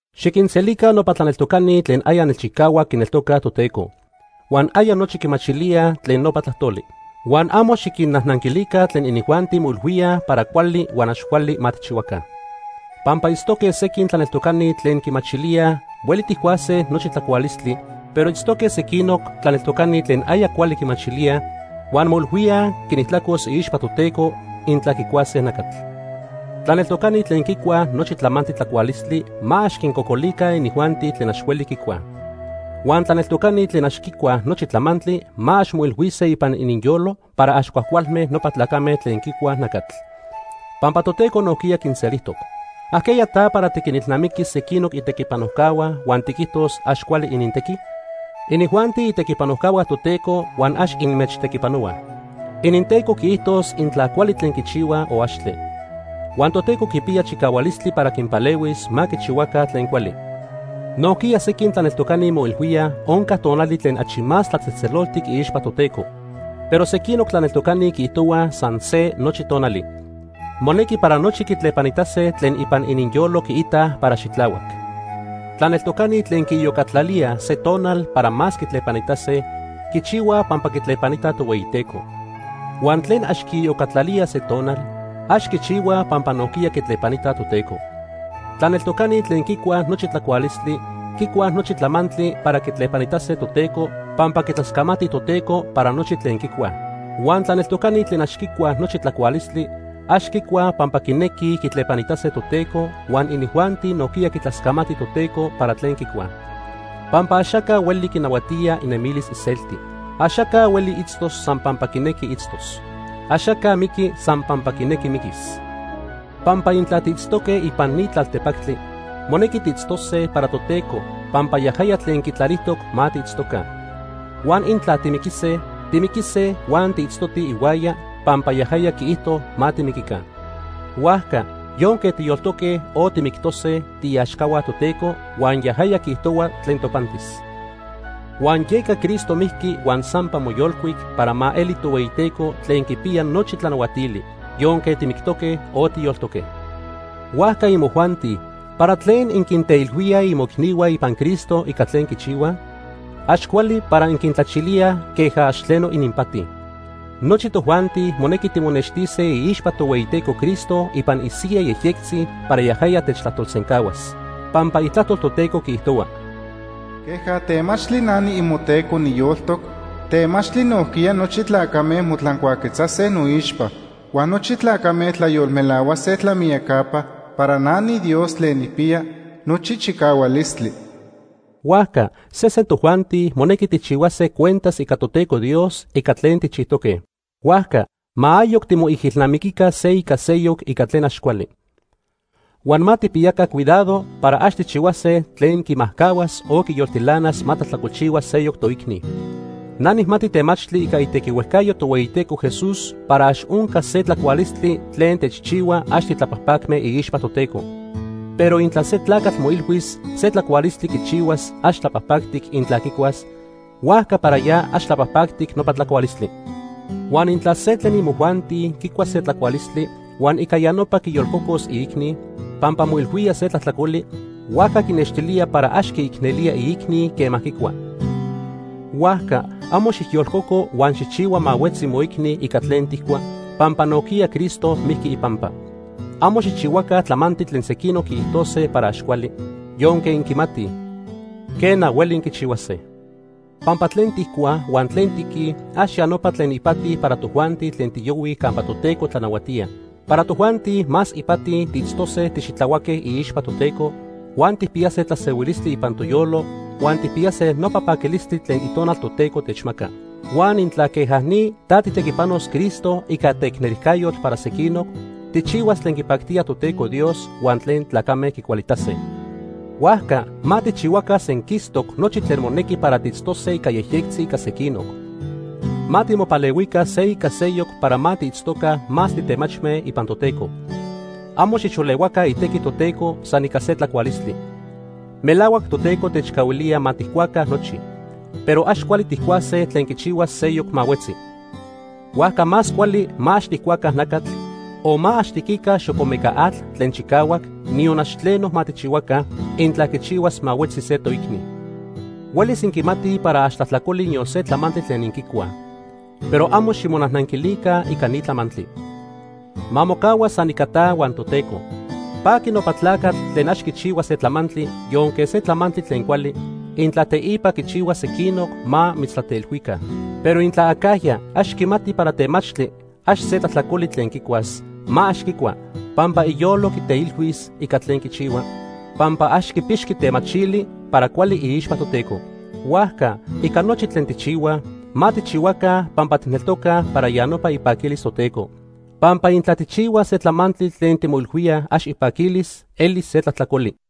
Xiquinselica nopa tlaneltocani tlen aya nelchicahuac quineltocaj Toteco, huan aya nochi quimachilíaj tlen nopa tlajtoli. Huan amo xiquinnajnanquilica tlen inijuanti moilhuíaj para cuali huan ax cuali ma tijchihuaca. Pampa itztoque sequin tlaneltocani tlen quimachilíaj hueli tijcuase nochi tlacualistli, pero itztoque sequinoc tlaneltocani tlen aya cuali quimachilíaj, huan moilhuíaj quinijtlacos iixpa Toteco intla quicuase nacatl. Tlaneltocani tlen quicuaj nochi tlamantli tlacualistli ma ax quincocolica inijuanti tlen ax hueli quicuaj. Huan tlaneltocani tlen ax quicuaj nochi tlamantli ma ax moilhuise ipan ininyolo para ax cuajcualme nopa tlacame tlen quicuaj nacatl, pampa Toteco nojquiya quinselijtoc. ¿Ajqueya ta para tiquinilnamiquis sequinoc itequipanojcahua huan tiquijtos ax cuali inintequi? Inijuanti itequipanojcahua Toteco huan ax inmechtequipanohuaj. IninTeco quiijtos intla cuali tlen quichihuaj o axtle. Huan Toteco quipiya chicahualistli para quinpalehuis ma quichihuaca tlen cuali. Nojquiya sequin tlaneltocani moilhuíaj onca tonali tlen achi más tlatzejtzeloltic iixpa Toteco. Pero sequinoc tlaneltocani quiijtohuaj san se nochi tonali. Monequi para nochi quitlepanitase tlen ipan ininyolo quiitaj para xitlahuac. Tlaneltocani tlen quiiyocatlalíaj se tonal para más quitlepanitase, quichihuaj pampa quitlepanitaj Tohueyiteco. Huan tlen ax quiiyocatlalíaj se tonal, ax quichihuaj pampa nojquiya quitlepanitaj Toteco. Tlaneltocani tlen quicuaj nochi tlacualistli, quicuaj nochi tlamantli para quitlepanitase Toteco pampa quitlascamatij Toteco para nochi tlen quicuaj. Huan tlaneltocani tlen ax quicuaj nochi tlacualistli, ax quicuaj pampa quinequij quitlepanitase Toteco huan inijuanti nojquiya quitlascamatij Toteco para tlen quicuaj. Pampa axaca hueli quinahuatía inemilis iselti. Axaca hueli itztos san pampa quinequi itztos. Axaca miqui san pampa quinequi miquis. Pampa intla tiitztoque ipan ni tlaltepactli, monequi tiitztose para Toteco pampa yajaya tlen quitlalijtoc ma tiitztoca. Huan intla timiquise, timiquise huan tiitztotij ihuaya pampa yajaya quiijto ma timiquica. Huajca yonque tiyoltoque o timictose, tiiaxcahua Toteco, huan yajaya quiijtohua tlen topantis. Huan yeca Cristo mijqui huan sampa moyolcuic para ma eli Tohueyiteco tlen quipiya nochi tlanahuatili, yonque timictoque, o tiyoltoque. Huajca imojuanti ¿para tlen inquinteilhuíaj imoicnihua ipan Cristo ica tlen quichihuaj? Ax cuali para inquintlachilíaj queja ax tleno ininpati. Nochi tojuanti monequi timonextise iixpa Tohueyiteco Cristo ipan isiyaj yejyectzi para yajaya techtlajtolsencahuas. Pampa Itlajtol Toteco quiijtohua: “Queja temachtli na niimoTeco niyoltoc, temachtli nojquiya nochi tlacame motlancuaquetzase noixpa. Huan nochi tlacame tlayolmelahuase tlamiyacapa para na niDios tlen nijpiya nochi chicahualistli.” Huajca sesen tojuanti monequi tijchihuase cuentas ica Toteco Dios ica tlen tijchijtoque. Huajca ma ayoc timoijilnamiquica se ica seyoc ica tlen ax cuali. Huan ma tijpiyaca cuidado para ax tijchihuase tlen quimajcahuas o quiyoltilanas ma tlajtlacolchihua seyoc toicni. Na nijmati temachtli ica itequihuejcayo Tohueyiteco Jesús para ax onca se tlacualistli tlen techchihua ax titlapajpacme iixpa Toteco. Pero intla se tlacatl moilhuis se tlacualistli quichihuas ax tlapajpactic intla quicuas, huajca para ya ax tlapajpactic nopa tlacualistli. Huan intla se tlen imojuanti quicua se tlacualistli, huan ica ya nopa quiyolcocos iicni, pampa moilhuía se tlajtlacoli, huajca quinextilía para ax quiicnelía iicni quema quicua. Huajca amo xijyolcoco huan xijchihua ma huetzi moicni ica tlen tijcua, pampa nojquiya Cristo mijqui ipampa. Amo xijchihuaca tlamantli tlen sequinoc quiijtose para ax cuali, yonque inquimatij, quena, hueli inquichihuase. Pampa tlen tijcuaj huan tlen tiquij ax ya nopa tlen ipati para tojuanti tlen tiyohuij campa Toteco tlanahuatía. Para tojuanti, más ipati tiitztose tixitlahuaque iixpa Toteco, huan tijpiyase tlasehuilistli ipan toyolo huan tijpiyase nopa paquilistli tlen Itonal Toteco techmaca. Huan intla queja ni ta tijtequipanos Cristo ica teicnelijcayotl para sequinoc, tijchihuas tlen quipactía Toteco Dios huan tlen tlacame quicualitase. Huajca ma tijchihuaca senquistoc nochi tlen monequi para tiitztose ica yejyectzi ica sequinoc. Ma timopalehuica se ica seyoc para ma tiitztoca más titemachme ipan Toteco. Amo xijxolehuaca itequi Toteco san ica se tlacualistli. Melahuac Toteco techcahuilía ma tijcuaca nochi. Pero ax cuali tijcuase tlen quichihuas seyoc ma huetzi. Huajca más cuali ma ax tijcuaca nacatl, o ma ax tiquica xocomeca atl tlen chicahuac, niyon ax tleno ma tijchihuaca, intla quichihuas ma huetzi se toicni. Huelis inquimatij para ax tlajtlacoli niyon se tlamantli tlen inquicuaj. Pero amo ximonajnanquilica ica ni tlamantli. Ma mocahua san ica ta huan Toteco. Paqui nopa tlacatl tlen ax quichihua se tlamantli, yonque se tlamantli tlen cuali, intla teipa quichihuas sequinoc ma mitztlateilhuica. Pero intla acajya ax quimati para temachtli ax se tlajtlacoli tlen quicuas, ma ax quicua, pampa iyolo quiteilhuis ica tlen quichihua, pampa ax quipixqui temachili para cuali iixpa Toteco. Huajca ica nochi tlen tijchihuaj, ma tijchihuaca pampa tijneltocaj para ya nopa ipaquilis Toteco. Pampa intla tijchihuaj se tlamantli tlen timoilhuíaj ax ipaquilis, elis se tlajtlacoli.